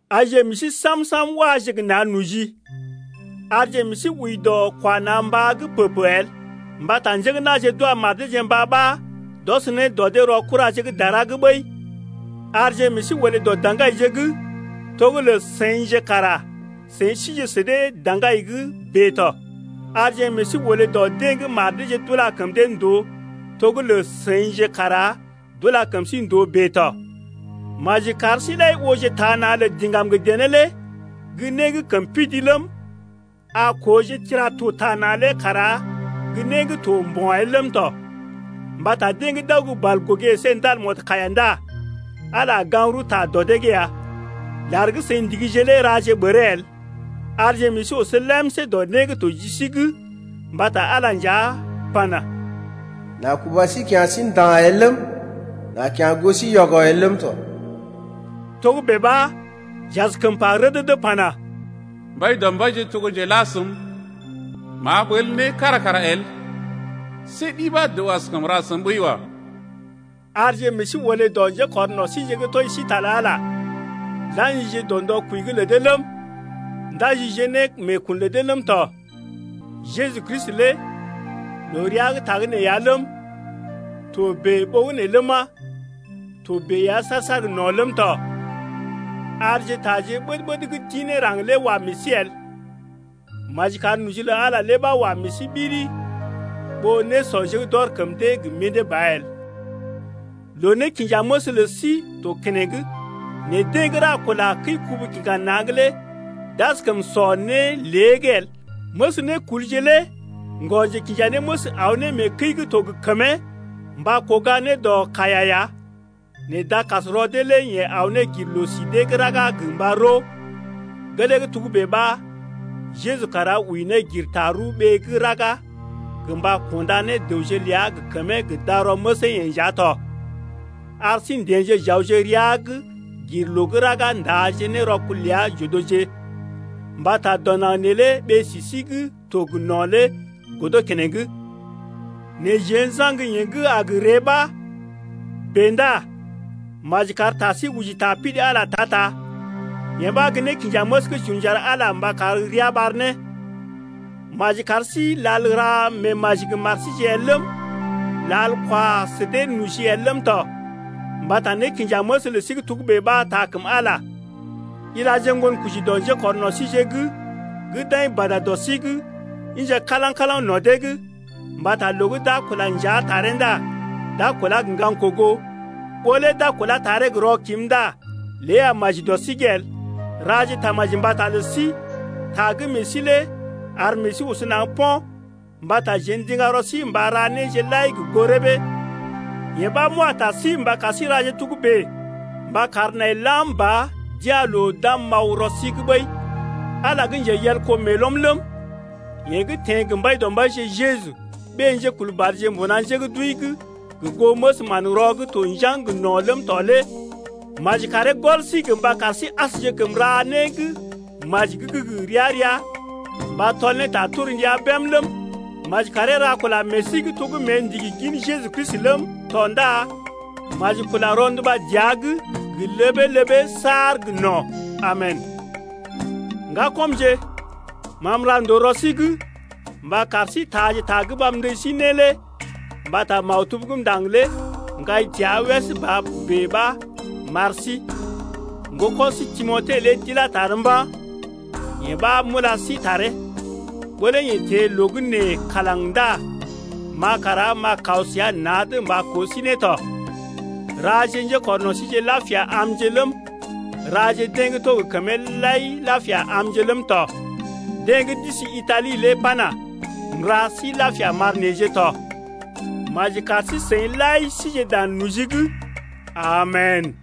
Aije meḛ sí sam-sam waje gə na̰ noji. Arje meḛ sí wəi dɔ kwa na̰ mbá’g pə-pə el, mbata njé gə́ na̰je d’wa mar deeje mbá ɓa d’ɔs ne dɔ dee rɔ kuraje gə́ dara’g ɓəi. Arje meḛ sí olé dɔ daŋgaije’g, to gə́ lə seḭje kara seḭ sije sə dee daŋgai’g bèe tɔ. Arje meḛ sí olé dɔ deḛ gə́ mar deeje d’ula kəm dee ndòo to gə́ seḭje kara d’ula kəm sí ndòo bèe tɔ. Maji kar sí-seḭ lai ooje taa na̰ lə diŋgam gə dené lé gə́ né gə́ kəm pidi ləm, a kooje tira-to taa na̰ lé kara gə́ né gə́ to mbo̰ el ləm tɔ. Mbata deḛ gə́ d’aw gə́ balgogé əsé ndal mɔdkaiya ndá Ala a gaŋg rəwta dɔ dee’g ya. Lar gə́ seḭ ndigije lé raje ɓəree el, arje meḛ sí oso lemsé dɔ né gə́ to ji sí’g mbata Ala nja pana: M’a kuba sí kya̰ sí nda̰ el ləm, m’a kya̰ goo sí yɔgɔ el ləm tɔ. Togə́bè ɓa j’askəm pa rədədə pana: Mbaidɔmbaije to gə́ njela səm, M’a ɓəl né kára kara el. See ɗi ɓa dəw askəm ra səm ɓəi wa. Arje meḛ sí olé dɔ njékɔrno̰ síje gə́ tɔji sí ta lə Ala, la̰jije dɔ ndɔ kwəi’g lə dee ləm, ndajije ne meekun lə dee ləm tɔ. Jeju Kristi lé loo rəa gə́ tagə́nè ya ləm, to bèe ɓogənè ləma, to bèe ya saar-saar gə no̰ ləm tɔ. Arje taje ɓəd-ɓəd gə́ d’ḭ ne raŋg lé wa meḛ sí el, maji kar noji lə Ala lé ɓa wa meḛ sí ɓiri ɓó nésɔje gə́ d’ɔr kəm dee gə mḭdé ba el. Loo-nékinjaməs lə sí to keneŋ nɛ deḛ gə́ ra kula kəi-kubu-kiŋga-na̰’g lé d’askəm sɔ né lée’g el. Məs nékulje lé ŋgɔ-njekinjanéməs aw ne mee kəi gə́ to gə kəmee mba kuga dɔ kaiya’g ya nɛ dakasrɔ dee lé yeḛ aw ne gir loo-si dee gə́ raga gə mba roo. Gelee gə́ togə́bè ɓa Jeju kara wəi ne gir tarəw ɓee gə́ raga gə mba kunda ne dəwje ləa gə kəmee gə darɔ məsee-yeḛ nja tɔ. Ar sí n’teḛje j’awje rəa’g gir loo gə́ raga n’taaje ne rɔkul ləa j’odoje. Mbata dɔ naŋg neelé ɓee-si sí gə́ to gə no̰ lé godo keneŋ, nɛ jeḛ n’saŋg yeḛ gə́ a gə ree ɓa. Bèe ndá maji kar ta sí oji ta pidi Ala ta-ta, yee ɓa gə́ nékinjaməs gə́ j’un j’ar Ala mba kar ria ɓar ne. Maji kar sí lal ra meemaji gə mar síje el ləm, lal kwa sə dee noji el ləm tɔ, mbata nékinjaməs lə sí gə́ togə́bè ɓa taa kəm Ala ya. Ilaje ŋgonkoji dɔ njékɔrno̰ síje’g gə́ d’aḭ bada dɔ sí’g, ḭje kalaŋ-kalaŋ no̰ dee’g, mbata loo gə́ d’a kula njea taree ndá d’a kulá gə ŋgaŋ kogo. Ɓó lé d’a kulá taree gə rɔkim ndá lé a maji dɔ sí’g el. Raje tamaji mbata lə sí, ta gə́ meḛ sí lé ar meḛ sí oso naŋg po̰, mbata jeḛ ndiŋga rɔ sí mba ra néje lai gə goo rəbee. Yee ɓa m’wa ta sí mba kar sí raje togə́bè mba kar nai lam ba d’ya̰ loo d’am m’aw rɔ sí’g ɓəi. Ala gə́ njeyelko meelɔm ləm, yeḛ gə́ teḛ gə Mbaidɔmbaije Jeju, ɓé-njekulbadje mbuna njé gə́ d’wəi’g gə goo məs manrɔ gə́ to njaŋg gə no̰ ləm tɔ lé maji karee gɔl sí gə mba kar sí asjekəm ra né gə́ maji gə́ gə ria-ria mba tɔl ne ta torndia bém ləm, maji karee ra kula meḛ sí’g to gə́ mée ndigi gin Jeju Kristi ləm tɔ ndá maji kula rɔnduba dəa’g gə ləbee-ləbee saar gə no̰. Amen! Ŋgakɔmje, ma m’ra ndòo rɔ sí’g mba kar sí taaje ta gə́ ma m’ndəji sí lé mbata maktub gə́ m’ndaŋg lé m’kai təa wès ba bèe ɓa m’ar sí. Ŋgoko̰ sí Timote lé d’ilá tar mba̰, yee ɓa m’ula sí taree. Ɓó lé yeḛ teḛ loo gə́ nee kalaŋ ndá ma kara m’a kaw səa na̰’d mba koo sí ne tɔ. Raje njekɔrno̰ síje lapia amje ləm, raje deḛ gə́ to gə kəmee lai lapia amje ləm tɔ. Deḛ gə́ d’isi Itali lé pana: M’ra sí lapia m’ar neḛje tɔ. Maji kar sí-seḭ lai sije dan noji’g. Amen!